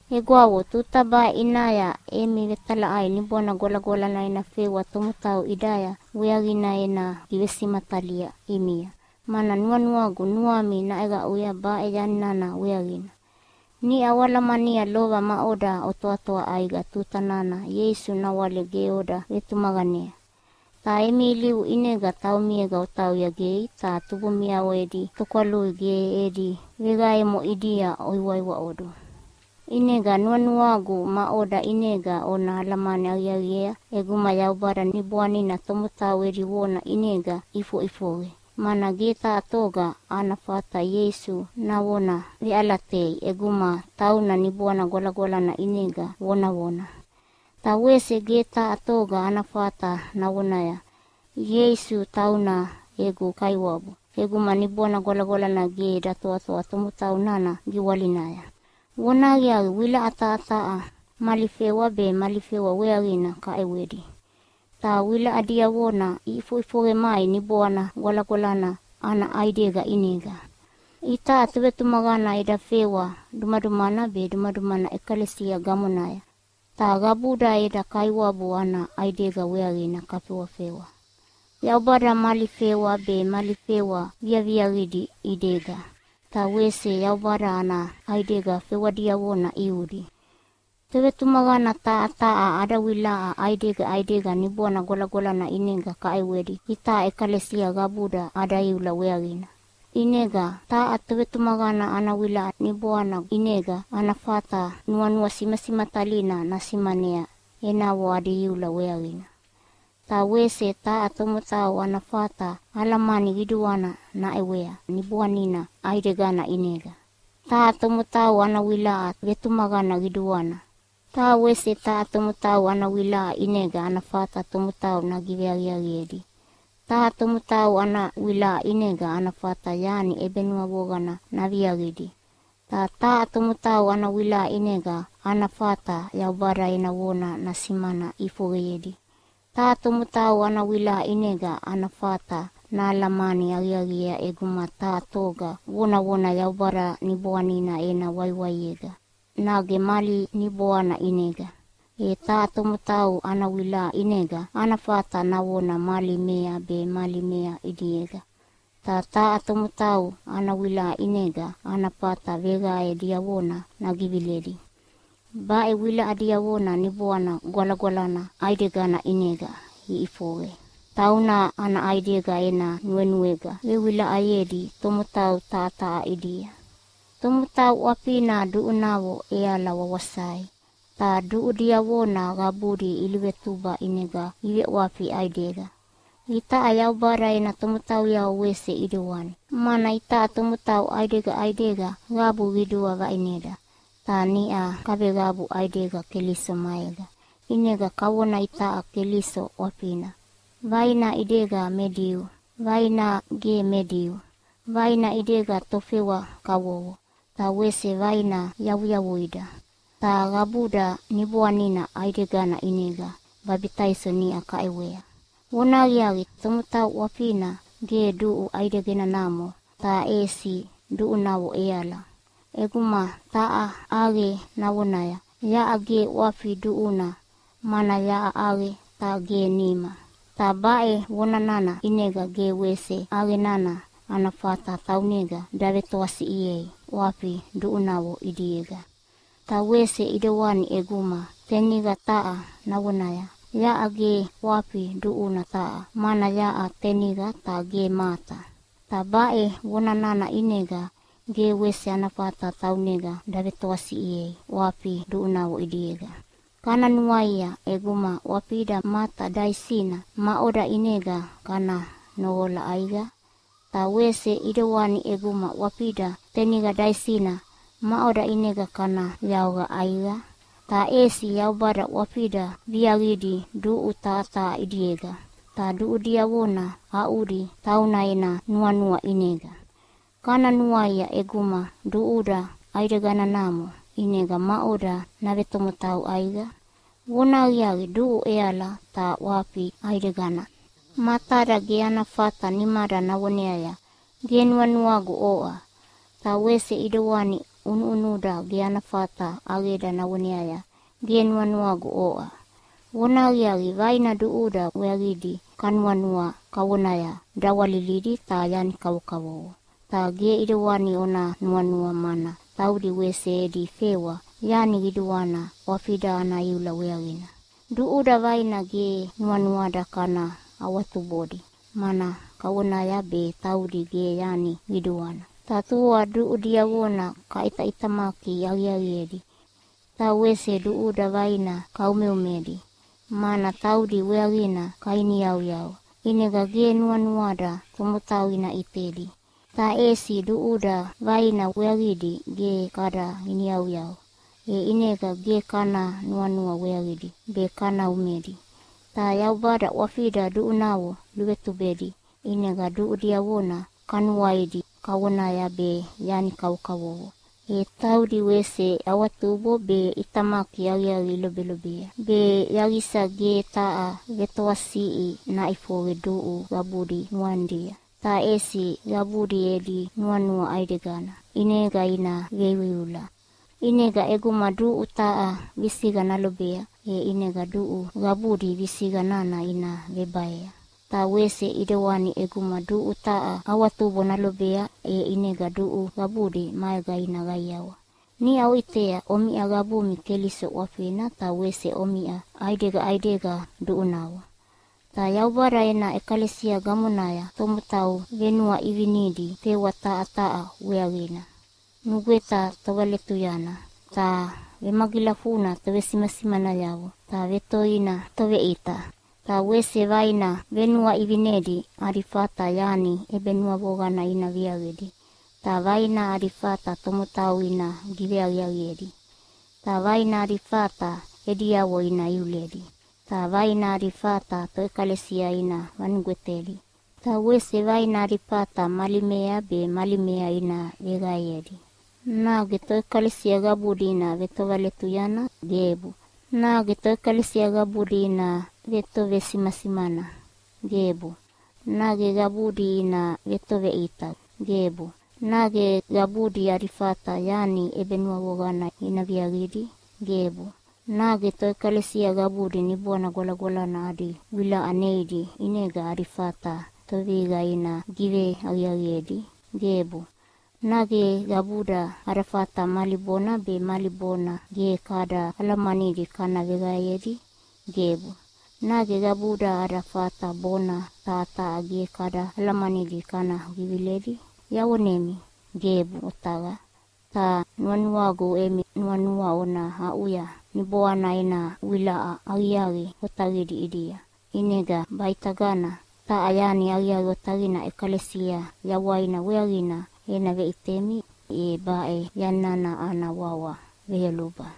Egwavo, tuta baʼe ʼinaya emi vetalaʼai Niboana Gwalagwalana ena fewa tomotau ʼidaya weaqina ena givesimatalia ʼimia, mana nuanuagu nuami naʼeqaʼuya baʼe yani nana weaqina. Niʼa oalamania lova maʼoda otoatoa ʼaiqa tuta nana Ieisu nawale ge oda vetumaqanea. Ta emi ilivu ʼinega taumiega otauya gei ta tubumiavo edi tokwalui ge edi veqaemo ʼidia oiwaiwaʼodu. ʼInega nuanuagu maʼoda ʼinega ona alamani aqiaqiea ʼeguma Yaubada Niboanina tomotau edi vona ʼinega ʼifoʼifoqe, mana ge taha toga ana fata Ieisu navona veʼalatei ʼeguma tauna Niboana Gwalagwalana ʼinega vonavona. Ta wese ge taha toga ana fata navonaya, “Ieisu tauna egu Kaiwabu” ʼeguma Niboana Gwalagwalana ge datoatoa tomotau nana giwalinaya. Vonahaqiaqi, wilaʼa taha taha mali fewa be mali fewa weaqina kaʼewedi, ta wilaʼa diavona iʼifoʼifoqe mai Niboana Gwalagwalana ana ʼaidega ʼinega. Itaʼa tovetumaqana eda fewa dumadumana be dumadumana ʼekalesia gamonaya, ta qabuda eda Kaiwabu ana ʼaidega weaqina kafewafewa. Yaubada mali fewa be mali fewa viaviaqidi ʼidega, ta wese Yaubada ana ʼaidega fewa diavona ʼiudi. Tovetumaqana taha taha ada wilaʼa ʼaidega ʼaidega Niboana Gwalagwalana ʼinega kaʼewedi itaʼa ʼekalesia qabuda ada iula weaqina. ʼInega taha tovetumaqana ana wilaʼa Niboana ʼinega ana fata nuanua simasimatalina nasimanea enavo adi iula weaqina, ta wese taha tomotau ana fata alamani qiduana naʼewea Niboanina ʼaidegana ʼinega. Taha tomotau ana wilaʼa vetumaqana qiduana. Ta wese taha tomotau ana wilaʼa ʼinega ana fata tomotau nagiveaqiaqiedi. Taha tomotau ana wilaʼa ʼinega ana fata yani ʼebenuavoqana naviaqidi, ta taha tomotau ana wilaʼa ʼinega ana fata Yaubada ena vona nasimana ʼifoqeyedi. Taha tomotau ana wilaʼa ʼinega ana fata nahalamani aqiaqiea ʼeguma taha toga vonavona Yaubada Niboanina ena waiwaiega, nage mali niboana ʼinega. E taha tomotau ana wilaʼa ʼinega ana fata navona mali mea be mali mea ʼidiega, ta taha tomotau ana wilaʼa ʼinega ana fata veqae diavona nagiviledi. Baʼe wilaʼa diavona Niboana Gwalagwalana ʼaidegana ʼinega iʼifoqe. Tauna ana ʼaidega ena nuenuega vewilaʼayedi tomotau taha taha ʼidia. Tomotau ʼwafina duʼunavo ʼeala wawasai, ta duʼu diavona qabudi iluvetuba ʼinega iveʼwafi ʼaidega. Itaʼa Yaubada ena tomotauyavo wese ʼidewani, mana itaʼa tomotau ʼaidega ʼaidega qabu qidua vaʼineda, ta niʼa kaveqabu ʼaidega Keliso maega. ʼInega kavona itaʼa Keliso ʼwafina. Vaina ʼidega me Diu, vaina ge me Diu, vaina ʼidega tofewa kavovo, ta wese vaina yavuyavuida. Ta qabuda Niboanina ʼaidegana ʼinega babitaiso niʼa kaʼewea. Vonahaqiaqi, tomotau ʼwafina ge duʼu ʼaideganamo, ta ʼesi duʼunavo ʼeala. ʼEguma taha ʼaqe navonaya, “Yaʼa ge ʼwafi duʼuna mana yaʼa ʼaqe ta ge nima.” Ta baʼe vona nana ʼinega ge wese ʼaqe nana ana fata taunega davetoasiʼiei ʼwafi duʼunavo ʼidiega. Ta wese ʼidewani ʼeguma teniqa taha navonaya, “Yaʼa ge ʼwafi duʼuna taha, mana yaʼa taniqa ta ge mata.” Ta baʼe vona nana ʼinega ge wese ana fata taunega davetoasiʼiei ʼwafi duʼunavo ʼidiega. Kana nuaia, ʼeguma ʼwafida mata daisina, maʼoda ʼinega kana noqola ʼaiqa? Ta wese ʼidewani ʼeguma ʼwafida teniqa daisina, maʼoda ʼinega kana yaoqa ʼaiqa? Ta ʼesi Yaubada ʼwafida viaqidi duʼu taha taha ʼidiega, ta duʼu diavona aʼudi tauna ena nuanua ʼinega. Kana nuaia, ʼeguma duʼuda ʼaideganamo, ʼinega maʼoda navetomotau ʼaiqa? Vonahaqiaqi, duʼu ʼeala, ta ʼwafi ʼaidegana. Matada ge ana fata nimada navoneaya, “Ge nuanuagu oʼa!” Ta wese ʼidewani ʼunuʼunuda ge ana fata ʼaqeda navoneaya, “Ge nuanuagu oʼa!” Vonahaqiaqi, vaina duʼuda weaqidi kanuanua kavonaya dawalilidi ta yani kavokavovo. Ta ge ʼidewani ona nuanua, mana taudi wese edi fewa yani qiduana ʼwafida ana iula weaqina. Duʼuda vaina ge nuanuada kana awatubodi, mana kavonaya be taudi ge yani qiduana, ta tua duʼu diavona kaʼitaʼitamaki aqiaqiedi. Ta wese duʼuda vaina kaumeumedi, mana taudi weaqina kainiyauyau, ʼinega ge nuanuada tomotau ina ʼitedi. Ta ʼesi duʼuda vaina weaqidi ge kada iniyauyau, e ʼinega ge kada nuanua weaqidi be kana umedi. Ta Yaubada ʼwafida duʼunavo luvetubedi, ʼinega duʼu diavona kanuaidi kavonaya be yani kavokavovo, e taudi wese awatubo be ʼitamaki aqiaqi ilobelobea, be yaqisa ge taha vetoatoasiʼi naʼifoqe duʼu qabudi nuanidia, ta ʼesi qabudi edi nuanua ʼaidegana ʼinega ina veiuiula. ʼInega ʼeguma duʼu taha visiqa nalobea, e ʼinega duʼu qabudi visiqa nana ina vebaea. Ta wese ʼidewani ʼeguma duʼu taha awatubo nalobea, e ʼinega duʼu qabudi maega ina qaiawa. Niʼa oʼitea, omiʼa qabumi Keliso ʼwafina, ta wese omiʼa ʼaidega ʼaidega duʼunavo. Ta Yaubada ena ʼekalesia gamonaya tomotau venuaʼivinidi fewa taha taha weaqina. Nugweta tovaletuyana, ta vemagilafuna tovesimasimanayavo, ta vetoina toveʼita. Ta wese vaina venuaʼivinedi adi fata yani ʼebenuavoqana ina viaqidi, ta vaina adi fata tomotau ina giveaqiaiqedi, ta vaina adi fata ediavo ina iuledi, ta vaina adi fata toʼekalesia ina vanugwetedi, ta wese vaina adi fata mali mea be mali mea ina veqaeyedi. Nage toʼekalesia qabudi ina vetovaletuyana? Gebu! Nage toʼekalesia qabudi ina vetovesimasimana? Gebu! Nage qabudi ina vetoveʼita? Gebu! Nage qabudi adi fata yani ʼebenuavoqana ina viaqidi? Gebu! Nage toʼekalesia qabudi Niboana Gwalagwalana adi wilaʼa neidi ʼinega adi fata tovevihiqa ina giveaqiaqiedi? Gebu! Nage qabuda ada fata mali bona be mali bona ge kada alamanidi kana veqaeyedi? Gebu! Nage qabuda ada fata bona taha taha ge kada alamanidi kana giviledi? Yavonemi, gebuʼe otaqa! Ta nuanuagu emi nuanua ona aʼuya Niboana ena wilaʼa aqiaqi otaqidi ʼidia. ʼInega baʼitagana taha yani aqiaqi otaqina ʼekalesia yawaina weaqina ena veʼitemi, e baʼe yani nana ana wawa veyoluba.